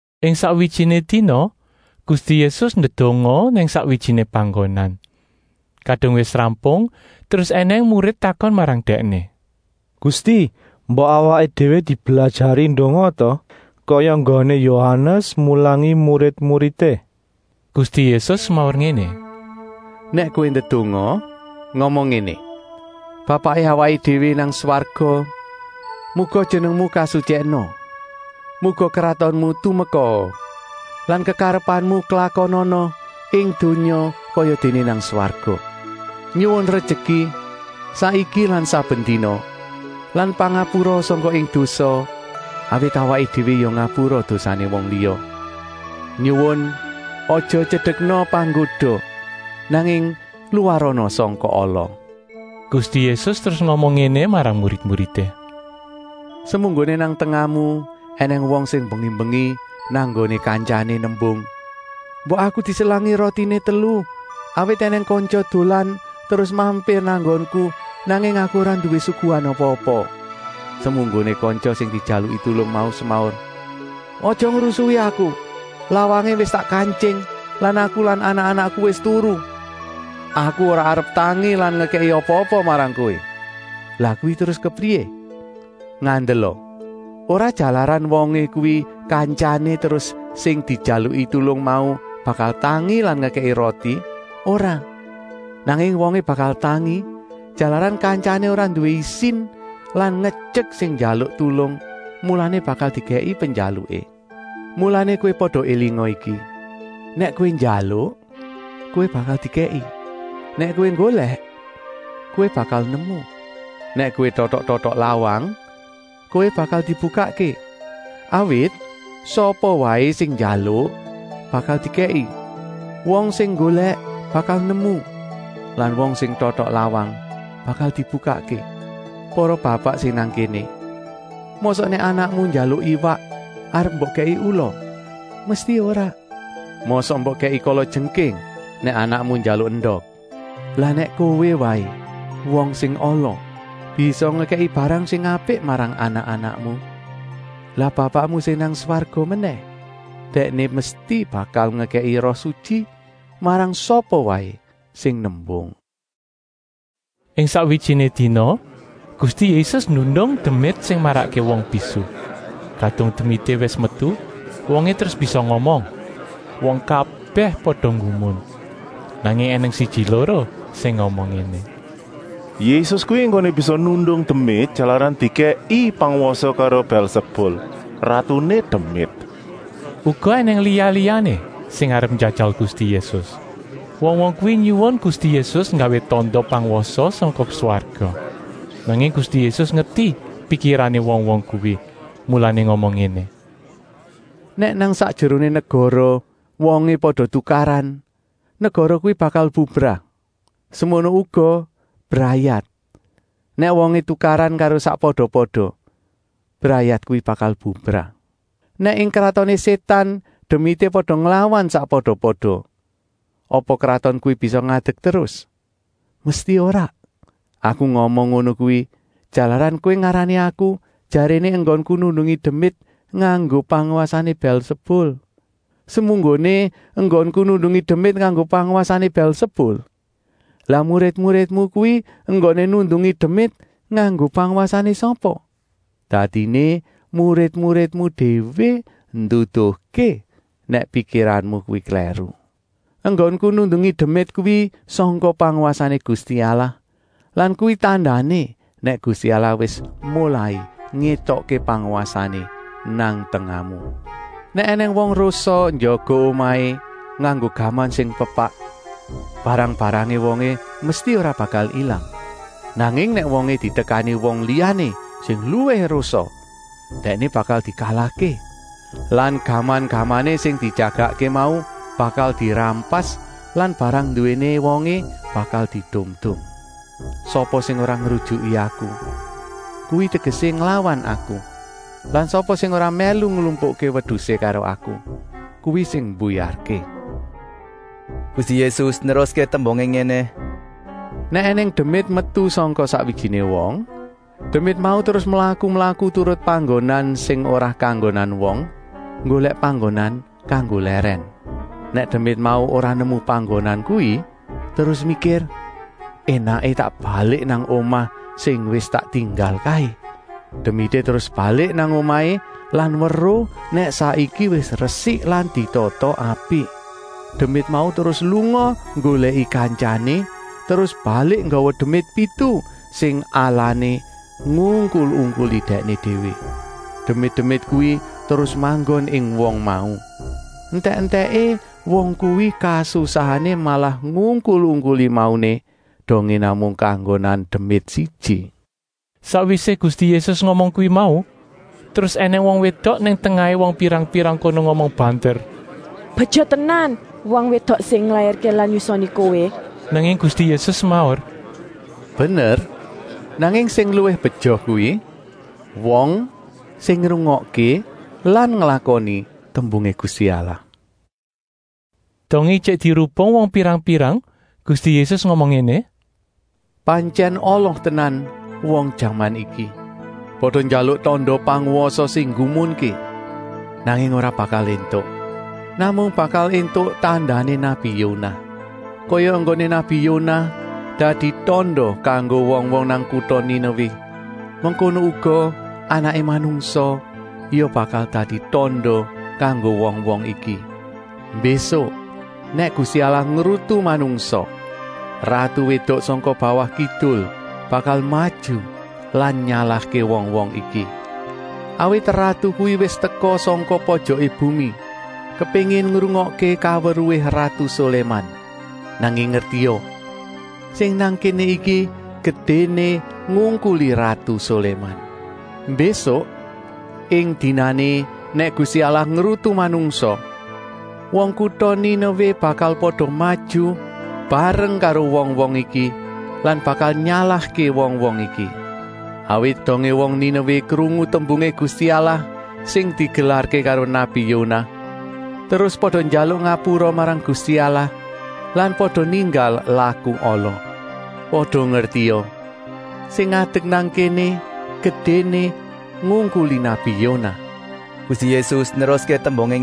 Ing sakwijiné dina Gusti Yésus ndedonga nang sakwijiné panggonan. Kadung wis rampung terus ènèng murid takon marang Dèkné: “Gusti, mbok awaké déwé diblajari ndonga ta, kaya enggoné Yohanes mulangi murid-muridé?” Gusti Yésus semaur ngéné: “Nèk kowé ndedonga, ngomong ngéné: ‘Bapaké awaké déwé nang swarga muga Jenengmu kasutyèkna. Muga kratonmu tumekaa lan kekarepanmu klakonana ing donya kayadéné nang swarga. Nyuwun rejeki saiki lan saben dina lan pangapura sangka ing dosa awit awaké déwé ya ngapura dosané wong liya. Nyuwun aja tyedekna panggoda nanging luwarana sangka ala.’” Gusti Yésus terus ngomong ngéné marang murid-muridé: “Semunggoné nang tengahmu ènèng wong sing mbengi-mbengi nang nggoné kantyané nembung: ‘Mbok aku diselangi rotiné telu, awit ènèng kantya dolan terus mampir nang nggonku, nanging aku ora nduwé suguhan apa-apa.’ Semunggoné kantya sing dijaluki tulung mau semaur: ‘Aja ngrusui aku, lawangé wis tak kantying lan aku lan anak-anakku wis turu. Aku ora arep tangi lan ngekèki apa-apa marang kowé.’ Lah kuwi terus kepriyé? Ngandela, ora jalaran wongé kuwi kantyané terus sing dijaluki tulung mau bakal tangi lan ngekèki roti, ora. Nanging wongé bakal tangi, jalaran kantyané ora nduwé isin lan ngetyek sing njaluk tulung, mulané bakal dikèki penjaluké. “Mulané kowé pada élinga iki: nèk kowé njaluk, kowé bakal dikèki; nèk kowé nggolèk, kowé bakal nemu; nèk kowé totok-totok lawang, kowé bakal dibukakké. Awit sapa waé sing njaluk bakal dikèki; wong sing nggolèk bakal nemu lan wong sing totok lawang bakal dibukakké. Para bapak sing nang kéné, mosok nèk anakmu njaluk iwak arep mbok kèki ula? Mesti ora! Mosok mbok kèki kalajengking nèk anakmu njaluk endok. Lah nèk kowé waé, wong sing ala, bisa ngekèki barang sing apik marang anak-anakmu, lah Bapakmu sing nang swarga menèh. Dèkné mesti bakal ngekèki Roh Sutyi marang sapa waé sing nembung.” Ing sakwijiné dina Gusti Yésus nundung demit sing marakké wong bisu. Kadung demité wis metu, wongé terus bisa ngomong. Wong kabèh pada nggumun. Nanging ènèng siji-loro sing ngomong ngéné: “Yésus kuwi enggoné bisa nundung demit jalaran dikèki pangwasa karo Bèlsebul, ratuné demit.” Uga ènèng liya-liyané sing arep njajal Gusti Yésus. Wong-wong kuwi nyuwun Gusti Yésus nggawé tanda pangwasa sangka swarga. Nanging Gusti Yésus ngerti pikirané wong-wong kuwi, mulané ngomong ngéné: “Nèk nang sakjeroné negara wongé pada tukaran, negara kuwi bakal bubrah. Semono uga brayat, nèk wongé tukaran karo sakpada-pada, brayat kuwi bakal bubrah. Nèk ing kratoné Sétan demité pada nglawan sakpada-pada, apa kraton kuwi bisa ngadek terus? Mesti ora. Aku ngomong ngono kuwi, jalaran kowé ngarani Aku jaréné enggonku nundungi demit nganggo pangwasané Bèlsebul. Semunggoné enggonku nundungi demit nganggo pangwasané Bèlsebul, lah murid-muridmu kuwi enggoné nundungi demit nganggo pangwasané sapa? Dadiné murid-muridmu déwé nduduhké nèk pikiranmu kuwi klèru. Enggonku nundungi demit kuwi sangka pangwasané Gusti Allah lan kuwi tandané nèk Gusti Allah wis molai ngétokké pangwasané nang tengahmu. “Nèk ènèng wong rosa njaga omahé nganggo gaman sing pepak, barang-barangé wongé mesti ora bakal ilang. Nanging nèk wongé ditekani wong liyané sing luwih rosa, dèkné bakal dikalahké lan gaman-gamané sing dijagakké mau bakal dirampas lan barang nduwéné wongé bakal diedum-edum. “Sapa sing ora ngrujuki Aku, kuwi tegesé nglawan Aku lan sapa sing ora mèlu nglumpukké wedusé karo Aku, kuwi sing mbuyarké.” Gusti Yésus neruské tembungé ngéné: “Nèk ènèng demit metu sangka sakwijiné wong, demit mau terus mlaku-mlaku turut panggonan sing ora kanggonan wong, nggolèk panggonan kanggo lèrèn. Nèk demit mau ora nemu panggonan kuwi, terus mikir: ‘Enaké tak balik nang omah sing wis tak tinggal kaé.’ Demité terus balik nang omahé lan weruh nèk saiki wis resik lan ditata apik. Demit mau terus lunga nggolèki kantyané, terus balik nggawa demit pitu sing alané ngungkul-ungkuli dèkné déwé. Demit-demit kuwi terus manggon ing wong mau. Entèk-entèké wong kuwi kasusahané malah ngungkul-ungkuli mauné, dongé namung kanggonan demit siji.” Sakwisé Gusti Yésus ngomong kuwi mau, terus ènèng wong wédok nang tengahé wong pirang-pirang kono ngomong banter: “Beja tenan wong wédok sing nglairké lan nyusoni Kowé!” Nanging Gusti Yésus semaur: “Bener, nanging sing luwih beja kuwi wong sing ngrungokké lan nglakoni tembungé Gusti Allah.” Dongé ijik dirubung wong pirang-pirang Gusti Yésus ngomong ngéné: “Pantyèn ala tenan wong jaman iki. Pada njaluk tanda pangwasa sing nggumunké, nanging ora bakal éntuk. Namung bakal éntuk tandané nabi Yonah. Kaya enggoné nabi Yonah dadi tanda kanggo wong-wong nang kuta Ninewé, mengkono uga Anaké Manungsa ya bakal dadi tanda kanggo wong-wong iki. Mbésuk nèk Gusti Allah ngrutu manungsa, ratu wédok sangka bawah kidul bakal maju lan nyalahké wong-wong iki. Awit ratu kuwi wis teka sangka pojoké bumi, kepéngin ngrungokké kaweruhé ratu Soléman. Nanging ngertia, sing nang kéné iki gedéné ngungkuli ratu Soléman. Mbésuk, ing dinané nèk Gusti Allah ngrutu manungsa, wong kuta Ninewé bakal pada maju mbarang karo wong-wong iki lan bakal nyalahké wong-wong iki. Awit dongé wong Ninewé krungu tembungé Gusti Allah sing digelarké karo nabi Yonah, terus pada njaluk ngapura marang Gusti Allah lan pada ninggal laku ala. Pada ngertia, sing ngadek nang kéné gedéné ngungkuli nabi Yonah.” Gusti Yésus neruské tembungé: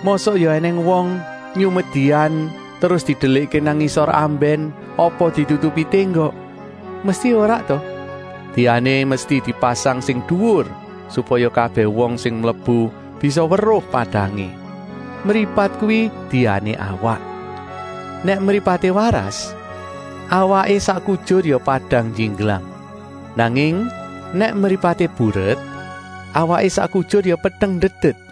“Mosok ya ènèng wong nyumet dian terus didelikké nang ngisor ambèn, apa ditutupi ténggok? Mesti ora ta! Diané mesti dipasang sing duwur, supaya kabèh wong sing mlebu bisa weruh padangé. Mripat kuwi diané awak. Nèk mripaté waras, awaké sak kujur ya padang njingglang. Nanging nèk mripaté buret, awaké sak kujur ya peteng ndedet.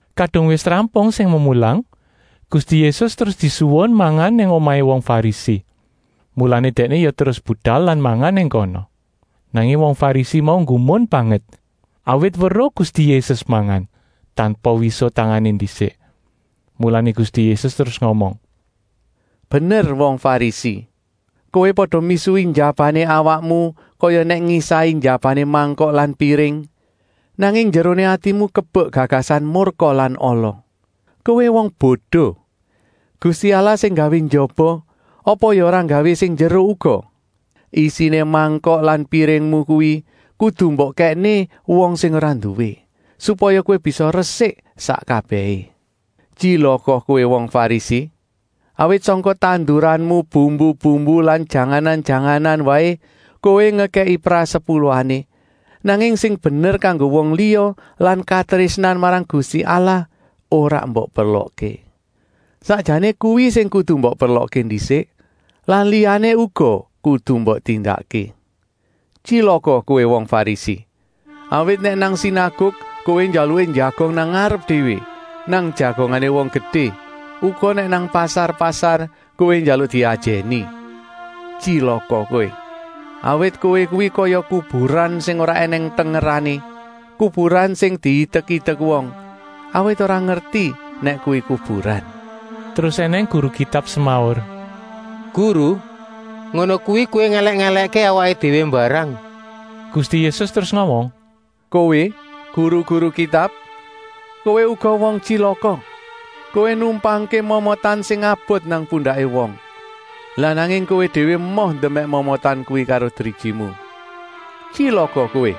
Kadung wis rampung sing memulang, Gusti Yésus terus disuwun mangan nang omahé wong Farisi. Mulané Dèkné ya terus budal lan mangan nang kono. Nanging wong Farisi mau nggumun banget, awit weruh Gusti Yésus mangan, tanpa wisuh tangané ndisik. Mulané Gusti Yésus terus ngomong: “Bener wong Farisi, kowé pada misuhi njabané awakmu kaya nèk ngisahi njabané mangkok lan piring, nanging njeroné atimu kebek gagasan murka lan ala. Kowé wong bodo, Gusti Allah sing nggawé njaba, apa ya ora nggawé sing njero uga? Isiné mangkok lan piringmu kuwi kudu mbok kèkné wong sing ora nduwé, supaya kowé bisa resik sak kabèhé. “Tyilaka kowé wong Farisi! Awit sangka tanduranmu bumbu-bumbu lan janganan-janganan waé kowé ngekèki prasepuluhané, nanging sing bener kanggo wong liya lan katrésnan marang Gusti Allah ora mbok perlokké. Sakjané kuwi sing kudu mbok perlokké ndisik lan liyané uga kudu mbok tindakké. “Tyilaka kowé wong Farisi! Awit nèk nang sinaguk kowé njalukké njagong nang ngarep déwé, nang jagongané wong gedé, uga nèk nang pasar-pasar kowé njaluk diajèni. Tyilaka kowé! Awit kowé kuwi kaya kuburan sing ora ènèng tengerané, kuburan sing diidek-idek wong, awit ora ngerti nèk kuwi kuburan.” Terus ènèng guru Kitab semaur: “Guru, ngono kuwi kowé ngèlèk-èlèkké awaké déwé mbarang!” Gusti Yésus terus ngomong: “Kowé guru-guru Kitab, kowé uga wong tyilaka! Kowé numpangké momotan sing abot nang pundaké wong, lah nanging kowé déwé emoh ndemèk momotan kuwi karo drijimu. Tyilaka kowé!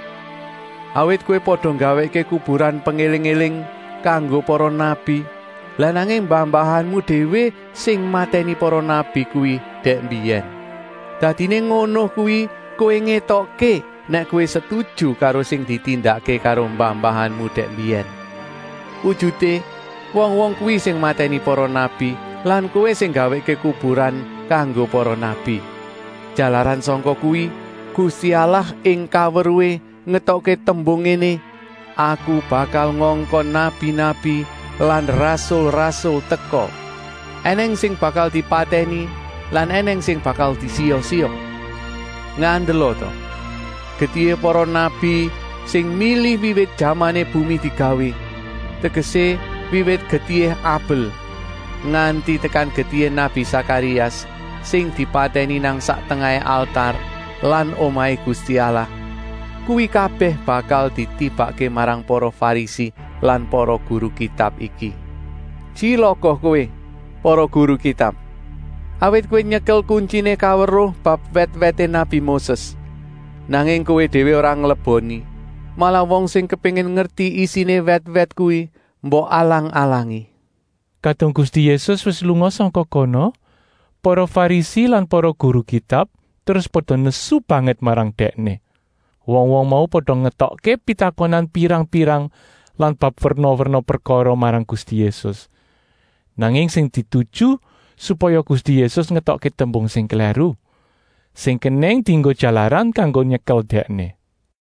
Awit kowé pada nggawèkké kuburan pengéling-éling kanggo para nabi, lah nanging mbah-mbahanmu déwé sing matèni para nabi kuwi dèk mbiyèn. Dadiné ngono kuwi kowé ngétokké nèk kowé setuju karo sing ditindakké karo mbah-mbahanmu dèk mbiyèn. Wujuté, wong-wong kuwi sing matèni para nabi lan kowé sing nggawèkké kuburan kanggo para nabi. Jalaran sangka kuwi, Gusti Allah ing kaweruhé ngetokké tembung ngéné: ‘Aku bakal ngongkon nabi-nabi lan rasul-rasul teka; ènèng sing bakal dipatèni lan ènèng sing bakal disiya-siya.’ Ngandela ta! Getihé para nabi sing mili wiwit jamané bumi digawé, tegesé wiwit getihé Abel, nganti tekan getihé nabi Sakarias, sing dipatèni nang sak tengahé altar lan Omahé Gusti Allah, kuwi kabèh bakal ditibakké marang para Farisi lan para guru Kitab iki. “Tyilaka kowé, para guru Kitab! Awit kowé nyekel kuntyiné kaweruh bab wèt-wèté nabi Moses, nanging kowé déwé ora ngleboni, malah wong sing kepéngin ngerti isiné wèt-wèt kuwi mbok alang-alangi!” Kadung Gusti Yésus wis lunga sangka kono, para Farisi lan para guru Kitab terus pada nesu banget marang Dèkné. Wong-wong mau pada ngetokké pitakonan pirang-pirang lan bab werna-werna prekara marang Gusti Yésus. Nanging sing dituju supaya Gusti Yésus ngetokké tembung sing klèru, sing kenèng dienggo jalaran kanggo nyekel Dèkné.